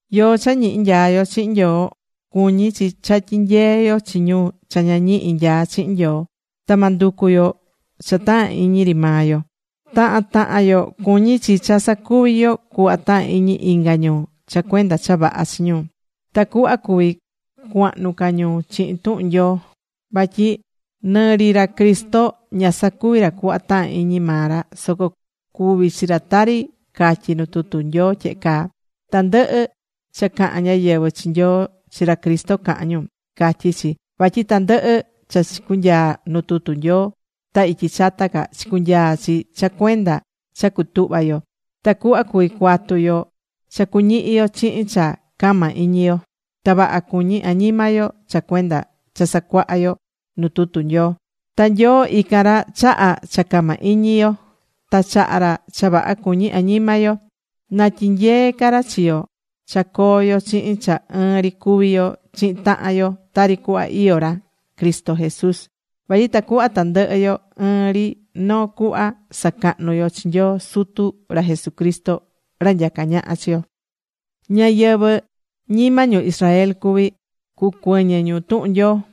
Yoó cha ñihi nyaá yo chihin Nyoo, cuñí chi cha tyi̱nyee yo chi ñu cha ña ñihi nyaá chihin Nyoo. Ta ma nducu yo cha tahán iñi ri maa yo. Tahan tahan yo cuñí chi cha sacuvi yo cuhva tahán iñi inga ñu cha cuenda cha vaha chi ñu, tacuhva cuví cuahnu ca ñu chihin tuhun Nyoo. Vatyi nɨ ri ra Cristo ña sacuvi̱ ra cuhva tahán iñi maa ra, soco cuvi̱ chi ra tari catyí nu tutu Nyoo tyehe caa: “Tandɨhɨ cha cahán ñáyɨvɨ chi Nyoo, chi ra Cristo cahán ñu”, catyí chi. Vatyi tandɨhɨ cha chicunyaa̱ nu tutu Nyoo ta ityi chata ca, chicunyaa̱ chi cha cuenda cha cutuhva yo, tacuhva cuví cuatu yo cha cuñihi yo chihin cha cama iñi yo. Ta vaha cuñí añima yo cha cuenda cha sacuahá yo nu tutu Nyoo. Ta Nyoo ican ra chahá cha cama iñi yo, ta chahá ra cha vaha cuñí añima yo. Na tyinyee ca ra chi yo cha coo yo chihin cha ɨɨn ri cuví yo chihin tahan yo tari cuhva iyó ra Cristo Jesús. Vatyi tacuhva tandɨhɨ yo ɨɨn ri noo cuhva sacahnu yo chi Nyoo Sutu ra Jesucristo ra nyacá ñaha chi yo.Ñáyɨvɨ ñima ñu Israel cuví, cucuɨñɨ ñu tuhun Nyoo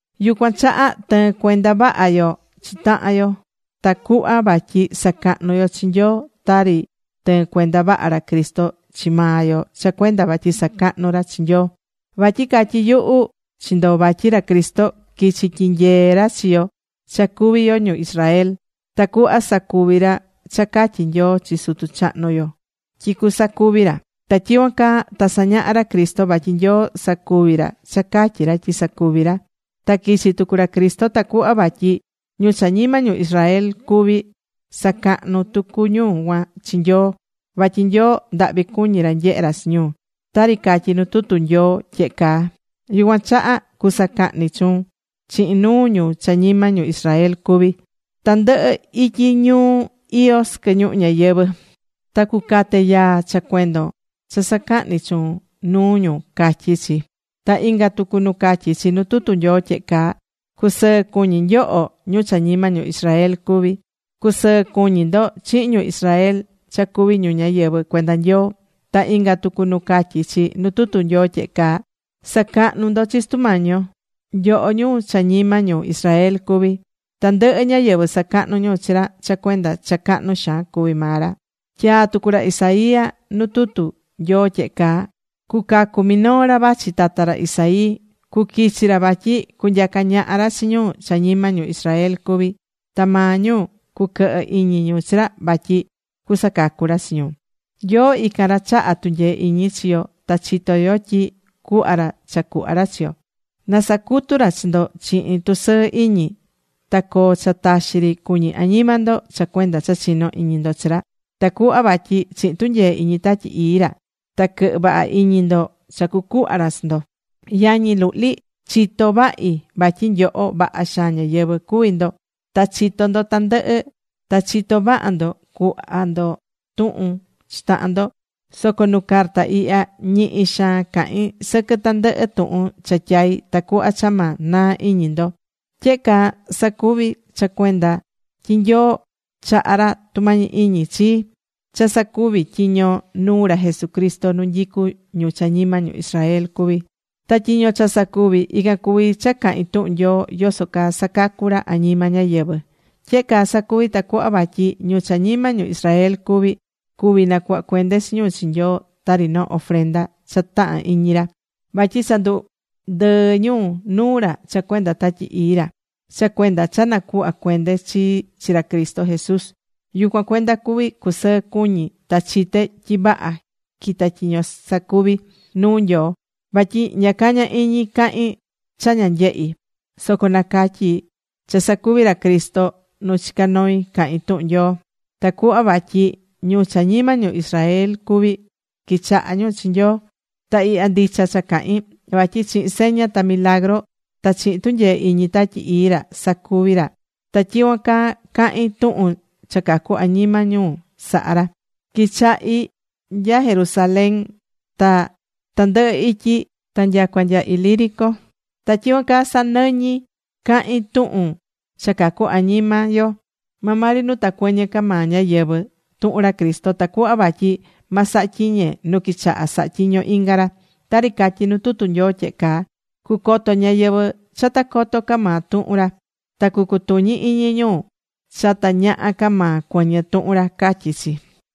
Yucuan chaha tɨ̱ɨn cuenda vaha yo chi tahan yo tacuhva vatyi sacahnu yo chi Nyoo tari tɨɨn cuenda vaha ra Cristo chi maa yo cha cuenda vatyi sacahnú ra chi Nyoo. Vatyi catyí yuhu chi ndo vatyi ra Cristo quichi̱ tyinyee ra chi yo cha cuví yo ñu Israel, tacuhva sacuvi ra cha catyi̱ Nyoo chi sutu chahnu yo tyi cusacuvi ra. Ta tyicuan caa ta sañaha̱ ra Cristo vatyi Nyoo sacuví ra cha catyí ra tyi sacuvi ra. Ta quichi̱ tucu ra Cristo tacuhva vatyi ñu cha ñima ñu Israel cuví sacahnu tucu ñu cuan chi Nyoo, vatyi Nyoo ndahvi cuñí ra nyehe ra chi ñu, tari catyí nu tutu Nyoo tyehe caa: Yucuan chaha cusacahni chuun chihin nuu ñu cha ñima ñu Israel cuví, tandɨhɨ ityi ñu iyó sɨquɨ ñuhu ñayɨvɨ̱. Ta cucate yaa cha cuenda cha sacahní chuun nuu ñu, catyí chi. Ta inga tucu nu catyí chi nu tutu Nyoo tyehe caa: Cusɨɨ cu̱ñi nyoho ñu cha ñima ñu Israel cuví. Cusɨɨ cu̱ñi ndo chihin ñu Israel cha cuví ñu ñáyɨvɨ cuenda Nyoo. Ta inga tucu nu catyí chi nu tutu Nyoo tyehe caa: Sa̱cahnu ndo chi Sutu Mañi yo, nyoho ñu cha ñima ñu Israel cuví. Tandɨhɨ ñáyɨvɨ sacahnú ñu chi ra cha cuenda cha cahnu xaan cuví maa ra. Tyaa̱ tucu ra Isaías nu tutu Nyoo tyehe caa: Cucacu minoo ra vachi tata ra Isaí. Cuquichi ra vatyi cunyaca ñaha ra chi ñu cha ñima ñu Israel cuví. Ta maa ñu cuquɨhɨ iñi ñu chi ra vatyi cusacacu ra chi ñu. Nyoo ican ra chahá tunyee iñi chi yo ta chitó yo tyi cuhva ra cha cuhva ra chi yo. ¡Na sacutu ra chi ndo chihin tusɨɨ iñi! Ta coo cha taxi ri cuñí añima ndo cha cuenda cha chinó iñi ndo chi ra, tacuhva vatyi chihin tunyee iñi Tatyi Ii ra ta quɨhɨ vaha iñi ndo cha cucuhva ra chi ndo. Yañi luhli, chitó vahi vatyi nyoho vaha xaan ñáyɨvɨ cuví ndo ta chitó ndo tandɨhɨ, ta chitó vaha ndo cuhva ndo tuhun chi tahan ndo. Soco nu carta ihya ñihi xaan cahín sɨquɨ tandɨhɨ tuhun cha tyai̱, tacuhva cha ma naa iñi ndo. Tyehe caa sacuvi̱ cha cuenda tyi Nyoo chaha̱ ra tumañi iñi chii cha sacuvi tyiño nuu ra Jesucristo nu nyicu ñu cha ñima ñu Israel cuví. Ta tyiño cha sacuví, ican cuví cha cahín tuhun Nyoo yoso caa sacacu̱ ra añima ñáyɨvɨ. Tyehe caa sacuví tacuhva vatyi ñu cha ñima ñu Israel cuví, cuví nacuhva cuende chi ñu chi Nyoo tari noo ofrenda cha tahan iñi ra, vatyi cha ndundɨɨ̱ ñu nuu ra cha cuenda Tatyi Ii ra. Cha cuenda cha nacuhva̱ cuende chii chi ra Cristo Jesús, yucuan cuenda cuví cusɨɨ cuñi ta chité tyi vaha quitá tyiño sacuví nuu Nyoo. Vatyi ña cañá iñi cahin cha ña nyehi̱. Soco nacatyí cha sacuvi̱ ra Cristo nu chicá noi cahín tuhun Nyoo tacuhva vatyi ñu cha ñima ñu Israel cuví quichaha ñu chi Nyoo. Ta ihya ndicha cha cahín. Vatyi chihin seña ta milagru ta chihin tunyee iñi Tatyi Ii ra sacuvi̱ ra. Ta tyicuan caa cahín tuhun cha cacu añima ñu sahá ra. Quichahi̱ nya Jerusalén ta tandɨhɨ ityi ta nyacua nya Ilírico. Ta tyicuan caa sanɨñí cahin tuhun cha cacu añima yo maa maa ri nu ta cuɨñɨ ca maa ñáyɨvɨ tuhun ra Cristo, tacuhva vatyi ma saha tyiñe nu quichaha̱ saha tyiño inga ra. Tari catyí nu tutu Nyoo tyehe caa: Cucoto ñáyɨvɨ cha ta coto ca maa tuhun ra. Ta cucutuñi iñi ñu cha ta ñaha ca maa cuɨñɨ tuhun ra, catyí chi.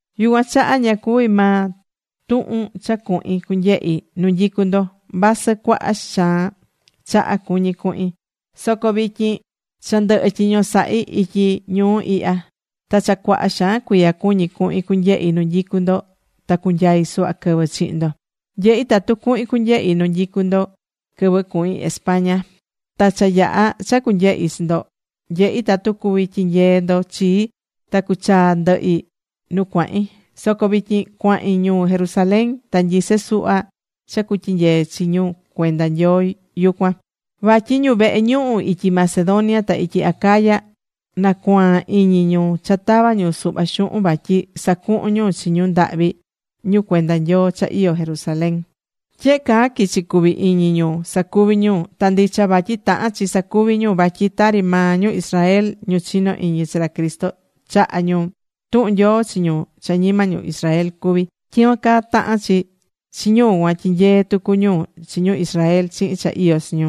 Yucuan chaha ña cuvi̱ maa tuhun cha cuhin cunyehi nu nyicú ndo, vasɨ cuaha xaan chaha cuñí cuhin. Soco vityin cha ndɨhɨ tyiño sahi̱ ityi ñuu ihya. Ta cha cuaha xaan cuiya cuñí cuhin cunyehi nu nyicú ndo ta cunyai suhva quɨvɨ chihin ndo. Nyehí tatu cuhin cunyehi nu nyicú ndo quɨvɨ cuhin España. Ta cha yaha cha cunyehi chi ndo, nyehi tatu cuvi tyinyee ndo chii ta cuchaa ndɨhi nu cuahin. Soco vityin cuahin ñuu Jerusalén ta nyisé suhva cha cutyinyee chi ñu cuenda Nyoo yucuan. Vatyi ñu vehe ñuhu ityi Macedonia ta ityi Acaya nacuaan iñi ñu cha tava ñu suhva xuhun vatyi sacuhun ñu chi ñu ndahvi ñu cuenda Nyoo cha iyó Jerusalén. Tyehe caa quichi̱ cuvi iñi ñu sacuví ñu. Ta ndicha vatyi tahán chi sacuvi ñu. Vatyi tari maa ñu Israel, ñu chinó iñi chi ra Cristo, chaha̱ ñu tuhun Nyoo chi ñu cha ñima ñu Israel cuví, tyicuan caa tahán chi chi ñu cuan tyinyee tucu ñu chi ñu Israel chihin cha iyó chi ñu.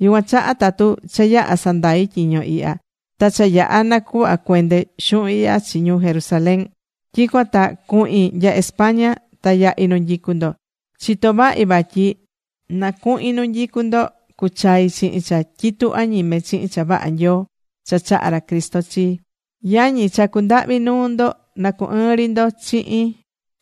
Yucuan chaha, tatu cha yaha sandai tyiño ihya, ta cha yaha nacuhva cuende xuhun ihya chi ñu Jerusalén, tyicuan ta cuhin nya España ta yahi nu nyicú ndo. Chitó vahi vatyi na cuhin nu nyicú ndo, cuchai chihin cha tyitu añime chihin cha vaha Nyoo cha chahá ra Cristo chii. Yañi, chacú ndahvi nuu ndo na cu ɨɨn ri ndo chihin,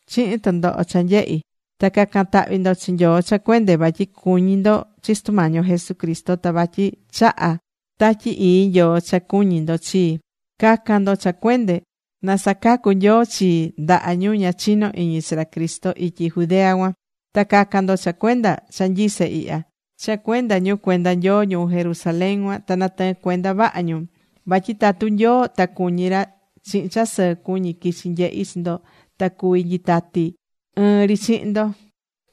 chihin tɨndoho cha nyehí, ta ca̱can tahvi ndo chi Nyoo cha cuende vatyi cuñí ndo chi Sutu Mañi yo Jesucristo, ta vatyi chahá Tatyi Ii Nyoo cha cuñí ndo chii. Ca̱can ndo cha cuende, na sacacu Nyoo chii ndaha ñu ña chinó iñi chi ra Cristo ityi Judea cuan. Ta ca̱can ndo cha cuenda cha nyisé ihya cha cuenda ñu cuenda Nyoo ñu Jerusalén cuan, na natɨɨn cuenda vaha ñu. Vatyi tatu Nyoo ta cuñí ra, chihin cha sɨɨ cuñi quichi nyehi chi ndo ta cuví nyitati ɨɨn ri chihin ndo.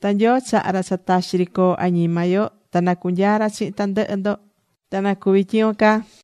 Ta Nyoo ra chahá cha taxi ri coo añima yo, na cunyaa ra chihin tandɨhɨ ndo. Ta na̱cuvi tyicuan caa.